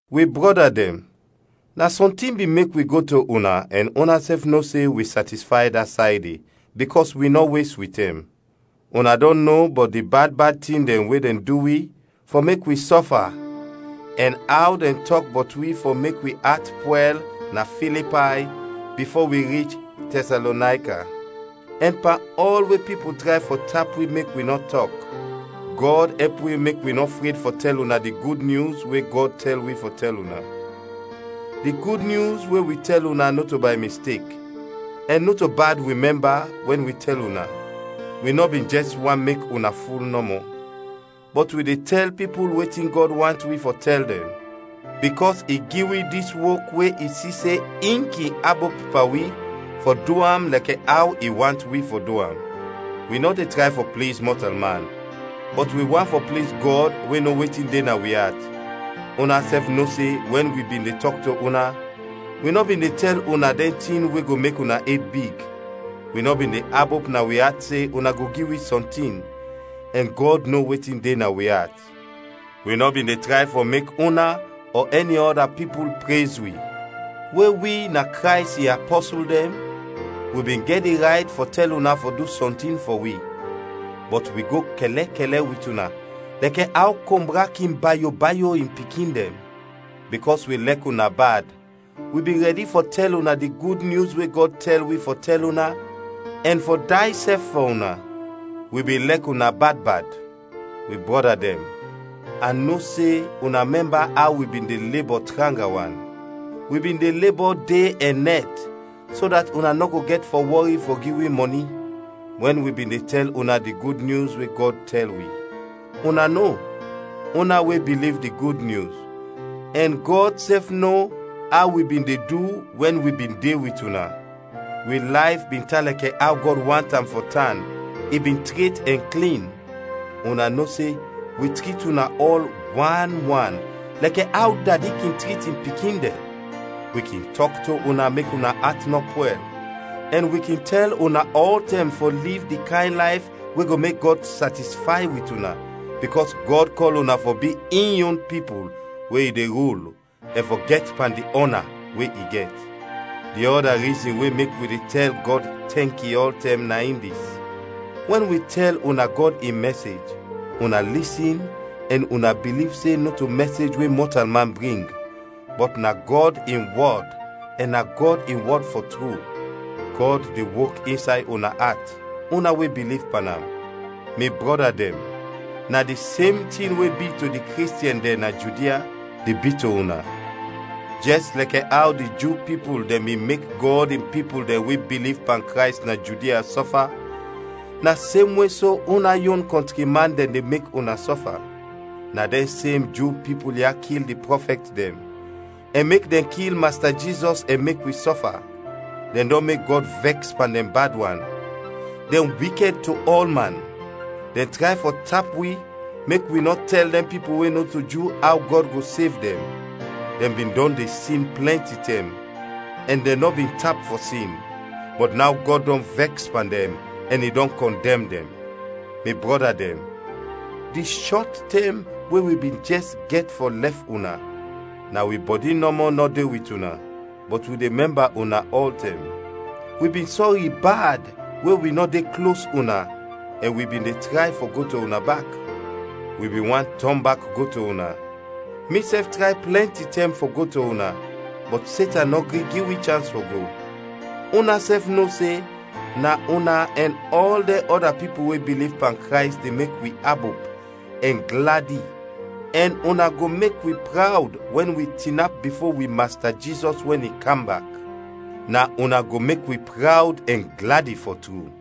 Wi brɔda dɛn, na sɔntin bin mek wi go to una ɛn unasɛf no se wi satisfay da say de, bikɔs wi nɔ wes wi tɛm. Una dɔn no bɔt di bad bad tin dɛn we dɛn du wi fɔ mek wi sɔfa ɛn aw dɛn tɔk bɔt wi fɔ mek wi at pwɛl na Filipay bifo wi rich Tɛsalonayka. Ɛn pan ɔl we pipul tray fɔ tap wi mek wi nɔ tɔk, Gɔd ɛp wi mek wi nɔ fred fɔ tɛl una di Gud Nyus we Gɔd tɛl wi fɔ tɛl una. Di Gud Nyus we wi tɛl una nɔto bay mistek, ɛn nɔto bad wi mɛmba wɛn wi tɛl una, wi nɔ bin jɛs want mek una ful nɔmɔ. Bɔt wi de tɛl pipul wetin Gɔd want wi fɔ tɛl dɛn, bikɔs i gi wi dis wok we i si se in kin abop pan wi fɔ du am lɛkɛ aw i want wi fɔ du am. Wi nɔ de tray fɔ pliz mɔtalman, bɔt wi want fɔ pliz Gɔd we no wetin de na wi at. Unasɛf no se wɛn wi bin de tɔk to una, wi nɔ bin de tɛl una dɛn tin we go mek una ed big, wi nɔ bin de abop na wi at se una go gi wi sɔntin, ɛn Gɔd no wetin de na wi at. Wi nɔ bin de tray fɔ mek una ɔ ɛni ɔda pipul prez wi. We wi na Krays in apɔsul dɛn, wi bin gɛt di rayt fɔ tɛl una fɔ du sɔntin fɔ wi, bɔt wi go kɛlɛkɛlɛ wit una lɛkɛ aw kombra kin bayo bayo in pikin dɛn. Bikɔs wi lɛk una bad, wi bin rɛdi fɔ tɛl una di Gud Nyus we Gɔd tɛl wi fɔ tɛl una ɛn fɔ day sɛf fɔ una. Wi bin lɛk una bad bad! Wi brɔda dɛn, a no se una mɛmba aw wi bin de lebɔ tranga wan! Wi bin de lebɔ de ɛn nɛt so dat una nɔ go gɛt fɔ wɔri fɔ gi wi mɔni, wɛn wi bin de tɛl una di Gud Nyus we Gɔd tɛl wi. Una no, una we biliv di Gud Nyus, ɛn Gɔd sɛf no aw wi bin de du wɛn wi bin de wit una. Wi layf bin tan lɛkɛ aw Gɔd want am fɔ tan, i bin tret ɛn klin. Una no se wi trit una ɔl wan wan lɛkɛ aw dadi kin trit in pikin dɛn. Wi kin tɔk to una mek una at nɔ pwɛl, ɛn wi kin tɛl una ɔltɛm fɔ liv di kayn layf we go mek Gɔd satisfay wit una, bikɔs Gɔd kɔl una fɔ bi in yon pipul we i de rul ɛn fɔ gɛt pan di ɔna we i gɛt. Di ɔda rizin we mek wi de tɛl Gɔd tɛnki ɔltɛm na in dis: wɛn wi tɛl una Gɔd in mɛsej, una lisin ɛn una biliv se nɔto mɛsej we mɔtalman bring, bɔt na Gɔd in wɔd ɛn na Gɔd in wɔd fɔ tru. Gɔd de wok insay una at, una we biliv pan am. Mi brɔda dɛn, na di sem tin we bi to di Kristiɛn dɛn na Judia, de bi to una. Jɛs lɛkɛ aw di Ju pipul dɛn bin mek Gɔd in pipul dɛn we biliv pan Krays na Judia sɔfa, na semwe so una yon kɔntri man dɛn de mek una sɔfa. Na dɛn sem Ju pipul ya kil di prɔfɛt dɛn, ɛn mek dɛn kil Masta Jizɔs ɛn mek wi sɔfa. Dɛn dɔn mek Gɔd vɛks pan dɛn bad wan! Dɛn wikɛd to ɔlman! Dɛn tray fɔ tap wi mek wi nɔ tɛl dɛn pipul we nɔto Ju aw Gɔd go sev dɛn. Dɛn bin dɔn de sin plɛnti tɛm, ɛn dɛn nɔ bin tap fɔ sin, bɔt naw Gɔd dɔn vɛks pan dɛn ɛn i dɔn kɔndɛm dɛn. Mi brɔda dɛn, di shɔt tɛm we wi bin jɛs gɛt fɔ lɛf una (na wi bɔdi nɔmɔ nɔ de wit una, bɔt wi de mɛmba una ɔltɛm), wi bin sɔri bad we wi nɔ de klos una ɛn wi bin de tray fɔ go to una bak. Wi bin want tɔn bak go to una. Misɛf tray plɛnti tɛm fɔ go to una, bɔt Setan nɔ gri gi wi chans fɔ go. Unasɛf no se na una ɛn ɔl dɛn ɔda pipul we biliv pan Krays de mek wi abop ɛn gladi ɛn una go mek wi prawd wɛn wi tinap bifo wi Masta Jizɔs wɛn i kam bak! Na una go mek wi prawd ɛn gladi, fɔ tru.